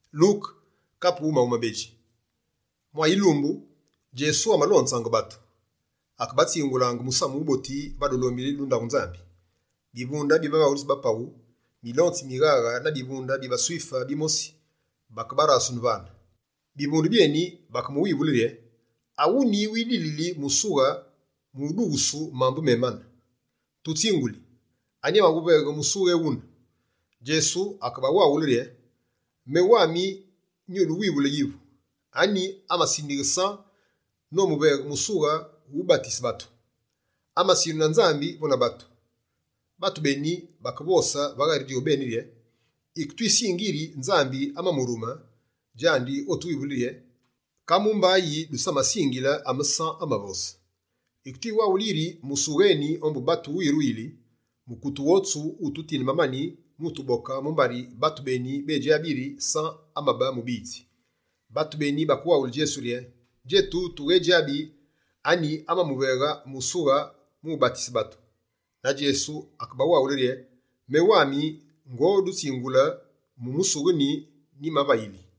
Djesu, anyi atsiwuveghe musughe awune? Mwa yilumbu, Djesu amalonzaange batu, akebatsingulaange musamu wuboti va dulombili du ndaghu Nzambi. Bivunde bi bavaghulitsi ba paghu, milonzi mi mighaghe na bivunde bi baSwife bimosi bakebarasune vane. Bivunde byeni bakemuwivule rye: «Awuni widilile musughe mu udughusu mambu mémane? Tutsinguli, anyi amawuveghe musughe ewune?» Djesu akebawaghule rye: «Menu wandi nyuduwivule yivu: Anyi amasindighe San nomuveghe musughe wu ubatise batu? Amasindughu na Nzambi vo na batu?» Batu beni, bakevosange va ghari djobeni rye: «Yike twisingi yiri Nzambi amamurume, djandi otuwivule rye: “Ka mumba yi dusamasingile ame San amavose?” Yike twimuwaghuli yiri musughe eni ombu batu wiruyili, mukute wotsu wututinde mamani mu utuboke, mumbari batu beni bédjabi yiri San amabe mubiyitsi.» Batu beni, bakewaghule Djesu rye: «Djetu, tughedjabi anyi amamuveghe musughe mu ubatise batu.» Na Djesu akebawaghule rye: «Menu wandi, ngodutsingule mu musughe nyi nyimavayili.»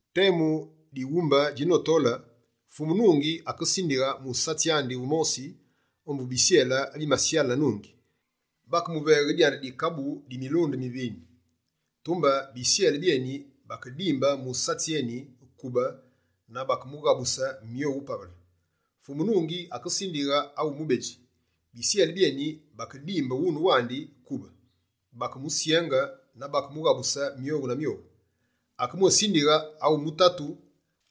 Temu dighumbe djinotole, fumu nungi akesindighe musatsi andi wumosi ombu bisyele abimasyale na nungi, Bakemuveghe dyandi dikabu di milunde mi vinye. Tumbe bisyele byeni bakedimbe musatsi eni kube na bakemughabuse myowu pavele. Fumu nungi, akesindighe awu mubedji, bisyele byeni bakedimbe wune wandi kube, bakemusyenge na bakemughabuse myowu na myowu. Akebwésindighe awu mutatu,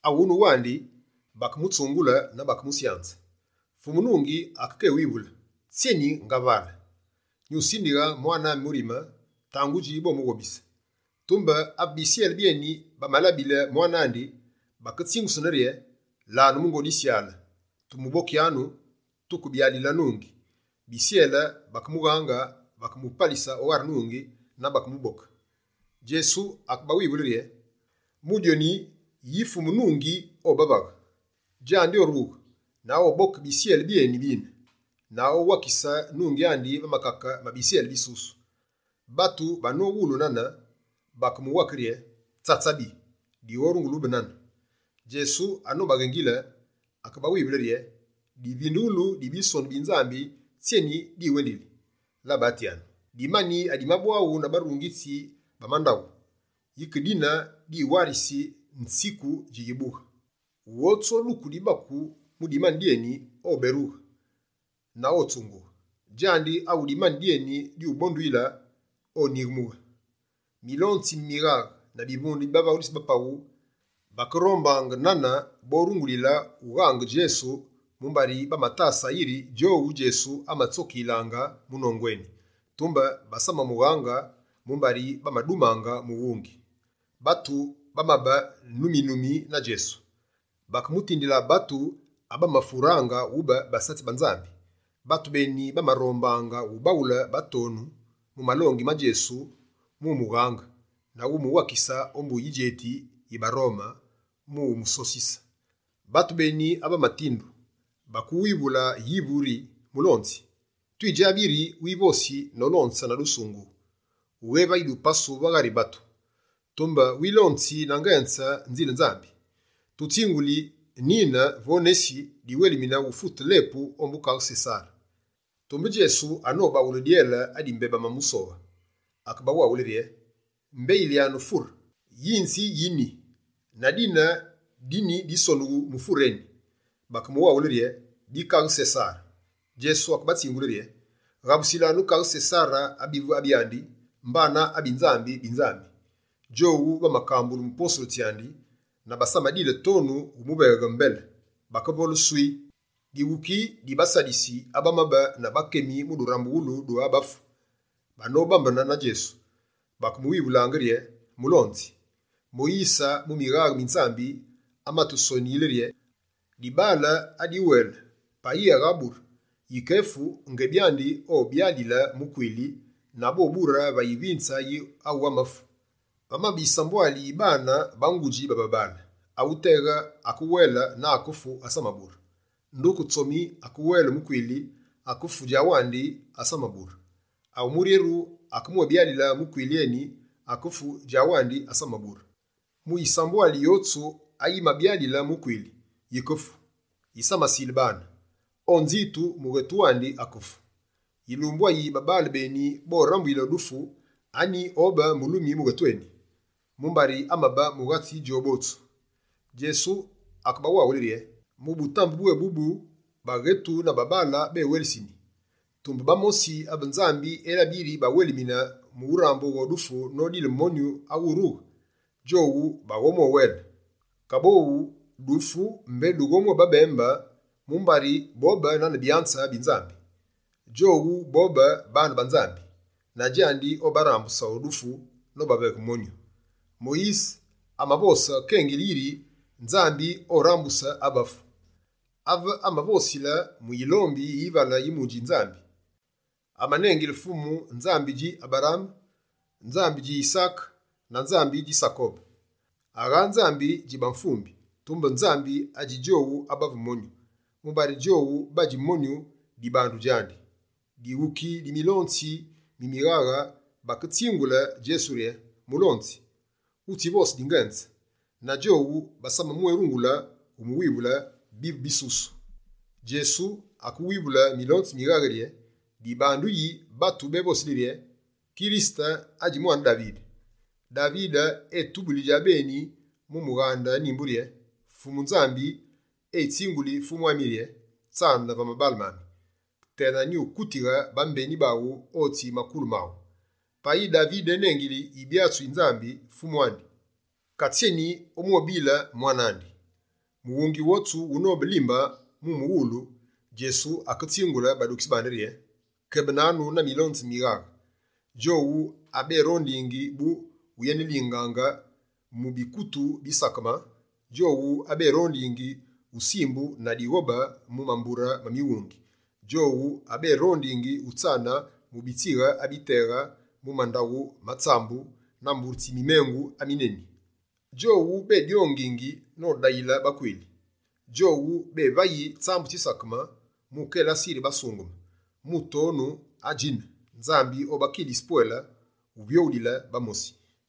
awune wandi, bakemutsungule na bakemusyanze. Fumu nungi akekewivule: “Tsyeni ngavale? Nyusindighe mwane ami murime, tangudji bomughobise.” Tumbe ave bisyele byeni bamalabile mwane andi, baketsingusunaange rye: “Lanu mungo disyale! Tumubokyanu, tuke byalile nungi.” Bisyele, bakemughange, bakemupalise o ghari nungi na bakemuboke.» Djesu akebawivule rye: «Mu dyoni, yike yi fumu nungi obavaghe? Djandi, orughe na oboke bisyele byeni bine, na owakise nungi andi va makake ma bisyele bisusu.» Batu banowulu nane, bakemuwake rye: «Tsatsabi, dighorungule ube nane!» Djesu anobaghengile, akebawivule rye: «Divindughulu di Bisonu bi Nzambi, tsyeni diwendili? Labatyanu: “Dimani adimabwaghu na barungitsi ba mandaghu, yike dine diwarisi nziku yibughe?” Wotsu oduku dibaku mu dimani dyeni, oberughe na otsungughe. Djandi awu dimani dyeni dyubonduyile, onyighemughe.» Milonzi mi mighaghe na bivunde bi bavaghulitsi ba paghu bakerombange nane borungulile wughange Djesu mumbari bamatasaange yiri djowu, Djesu amatsokiyilaange mu nongu eni. Tumbe basamamughaange mumbari bamadumange mughungi. Batu bamabe numi-numi na Djesu. Bakemutindile batu abamafuraange ube basatsi ba Nzambi. Batu beni bamarombaange ubaghule batonu mu malongi ma Djesu mu umughange, na umuwakise ombu yidjeti yi baRome mu umusosise. Batu beni abamatindu, bakemuwivule yivu rye: «Mulonzi, twidjabi yiri wivosi nolonze na dusungughu; wughévayi dupasu va ghari batu, tumbe wilonzi na ngenze nzile Nzambi. Tutsinguli nine vo nesi, diwelimine mu ufute lepu ombu Kaghe Sesare?» Tumbe Djesu anobaghule dyele adi mbé bamusoghe, akebawaghule rye: «Mbeyilyanu fure. Yinzi yi nyi? Na dine di nyi bisonughu mu fure eni?» Bakemuwaghule rye: «Bi Kaghe Sesare.» Djesu amabatsingule rye: «Ghabusilanu Kaghe Sesare abivu abyandi, mbana abi Nzambi, bi Nzambi.» Djowu bamakambulu mu posulu tsyandi na basamadile tonu mu umuveghe mbele. Bakevole «swii». Dighuki di baSadisi abamabe na bakemi mu durambughulu du abafu, banobambene na Djesu, bakemuwivulaange rye: «Mulonzi, Moyise, mu mighaghe mi Nzambi, amatusoniyile rye: “Dibaale adiwele, payi aghaabure, yike efu, ngebi andi obyalile mukwili na bobure va yivinze yi awu amafu.” Vamabe yisambwali yi baane ba ngudji ba babaale. Awuteghe akewele na akefu, asamabure. Nduke tsomi [akewele mukwili, akefu djandi wandi asamabure.] Awu muryeru akemwébyalile mukwili eni, akefu djandi wandi, asamabure. Mu yisambwali yotsu ayi mabyalile mukwili, yikefu, yi samasile baane. O nzitu, mughetu wandi akefu. Yilumbu ayi babaale beni borambuyile o dufu, anyi obe mulumi mughetu eni? Mumbari amabe mughatsi djowu botsu.» Djesu akebawaghule rye: «Mu butambe bwébubu, baghetu na babaale béwelisini, tumbe bamosi abe Nzambi elabi yiri bawelimine mu urambughe o dufu nodile monyu awurughe, djowu baghomwéwele. Kaboghu, dufu mbé dughobwébabembe, mumbari bobe nane byanze bi Nzambi. Djowu bobe baane ba Nzambi, na djandi obarambuse o dufu nobaveghe monyu. Moyise amavose kengili yiri Nzambi orambuse abafu. Ave amavosile mu yilombi yi yivale yi mudji Nzambi, amanengile Fumu “Nzambi dji Aberaame, Nzambi dji Yisaake na Nzambi dji Sakobe.” Agha Nzambi dji bamvumbi, tumbe Nzambi adji djowu abavu monyu, mumbari djowu badji monyu dibandu djandi.» Dighuki di milonzi mi mighaghe baketsingule Djesu rye: «Mulonzi, wutsivose dingenze.» Na djowu, basamamwérungule umuwivule bivu bisusu. Djesu akewivule milonzi mi mighaghe rye: «Dibandu yi batu bévosili rye: “Kirisete, adji mwane Davide?” Davide etubuli djabeni mu mughande Nyimbu rye: “Fumu Nzambi etsinguli Fumu ami rye: Tsane va mabaale mami, tena nyukutighe bambeni baghu, otsi makulu maghu.” Payi Davide enengili Yibyatsi yi Nzambi “Fumu andi”, ka tsyeni omwébile mwane andi?» Mughungi wotsu wunobe limbe mu umuwululu, Djesu aketsingule badukitsi bandi rye: «Kebenanu na milonzi mi mighaghe, djowu aberondingi bu uyenelingaange mu bikutu bisakeme, djowu aberondingi usimbungu na dighobe mu mambure ma mighungi, djowu aberondingi utsane mu bitsighe abiteghe mu mandaghu ma tsambu na mbure tsi mimengu amineni, djowu bédyongi nodayile bakwili, djowu bévayi tsambu tsisakeme mu ukelase yiri basungeme. Mu tonu adjine, Nzambi obakilisi pwele uvyoghulile bamosi.»